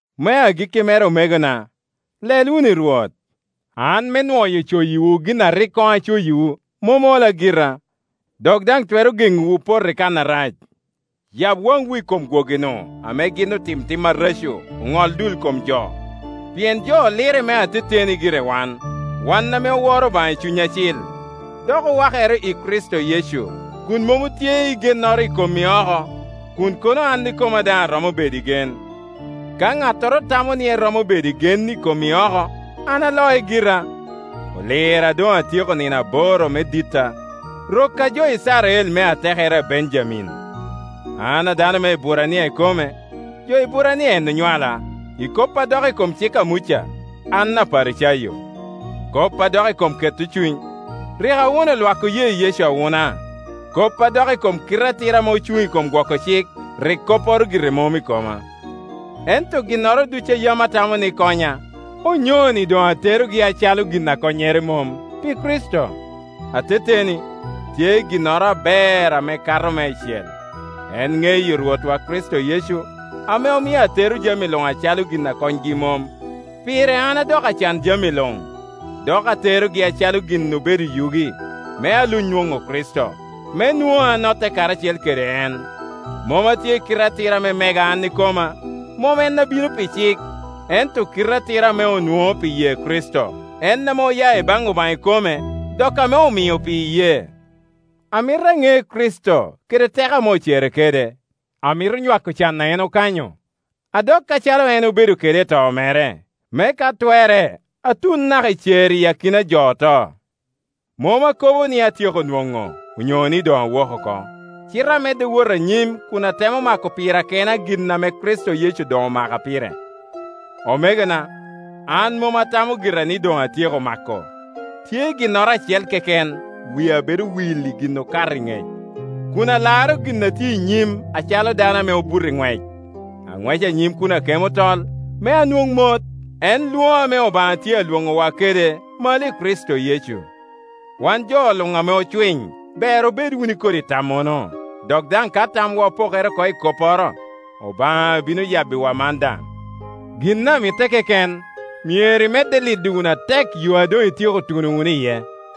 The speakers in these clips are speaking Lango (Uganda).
Me agikki mere omegona, lel wunu i Rwot. An me nwoyo coyiwu gin a rik koŋ acoyiwu, mom ola gira, dok daŋ twero geŋowu poto i kan arac. Yab waŋwu i kom gwogi-nu, ame gin otim tim areco, oŋol dul kom jo. Pien jo olirre me ateteni gire wan, wan ame oworo Obaŋa i Cuny Acil, dok owakere i Kricito Yecu, kun mom otye i gennoro i kom i oko. Kun kono an ikoma daŋ aromo bedo i gen, ka ŋattoro tamo ni eromo bedo i gen i kom i oko, an aloc gira. Olira a doŋ atyeko nino aboro me ditta, rokka jo Icrael me i atekere a Benjamin. An a dano me Eburania ikome, jo Eburania en onywala, i kop a dok i kom cik a Muca, an abedo Aparicayo. Kop a dok i kom keto cuny, rik awuno lwak oye Yecu awuna. Kop a dok i kom kite atira ame ocuŋ i kom gwoko cik, rik kopporo gire mom i koma. Ento ginnoro ducu a yam atamo ni konya, onyoni doŋ aterogi acalo gin a konnyere mom, pi Kricito. Ateteni, tye ginnoro aber ame okato meicel, en iŋeyo Rwotta Kricito Yecu, ame omio atero jami luŋ acalo gin a konygi mom. Pire an adoko acan jami luŋ, dok aterogi acalo gin obedo yugi, me aluny nwoŋo Kricito, me nwoŋa anotte karacel kede en. Mom atye i kite atira ame mega an ikoma, mom en a bino pi cik, ento kite atira ame onwoŋo pi ye Kricito, en ame oya i baŋ Obaŋa ikome dok ame omio pi iyee. Amito aŋe Kricito, kede teko ame ocere kede; amito nywako can a en okanyo, adok acalo en obedo kede i to mere, me ka twerre atun naka i cer iyi akina a jo oto. Mom akobo ni atyeko nwoŋo, onyo ni doŋ awok oko, cite amedde wot anyim kun atemo mako pira kena gin ame Kricito Yecu doŋ omaka pire. Omegona, an mom atamo gira ni doŋ atyeko mako; tye ginnoro acel keken: wia bedo will i gin okato i ŋec, kun alaro gin a tye i nyim acalo dano ame obuto i ŋwec. Aŋweco anyim kun akemo tol, me anwoŋ mot, en lwoŋo ame Obaŋa tye alwoŋowa kede malo i Kricito Yecu. Wan jo luŋ ame ocwiny ber obed wunu i kodi tammono; dok daŋ ka tamwu opokere oko i kopporo, Obaŋa bino yabbiwu man daŋ. Gin a mitte keken, myero imedde lido wunu atek yo a doŋ ityeko tuno wunu iye.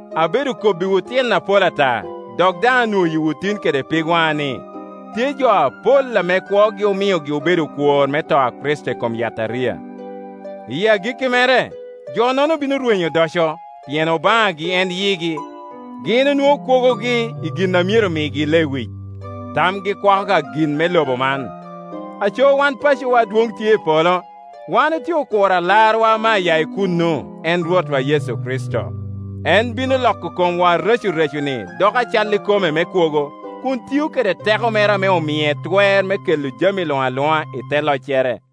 Abedo kobbiwu tyen apol ata, dok daŋ anwoyiwu tin kede pigwaŋa ni, tye jo apol ame kwogi omiogi obedo okwor me to a Kricito i kom yataria. I agikki mere, jo-nono bino rwenyo odoco, pien obaŋagi en yigi, gin onwoŋo kwogogi i gin a myero migi lewic, tamgi kwako ka gin me loba man. Aco wan pacowa adwoŋ tye i polo; wan otye okuro Alarwa ame aya i kuno, en Rwotwa Yecu Kricito. En bino loko komwa, arecoreconi doko acalli kome me kwogo, kun tio kede teko mere ame mie twer me kela jami luŋ aluŋa i te loccere.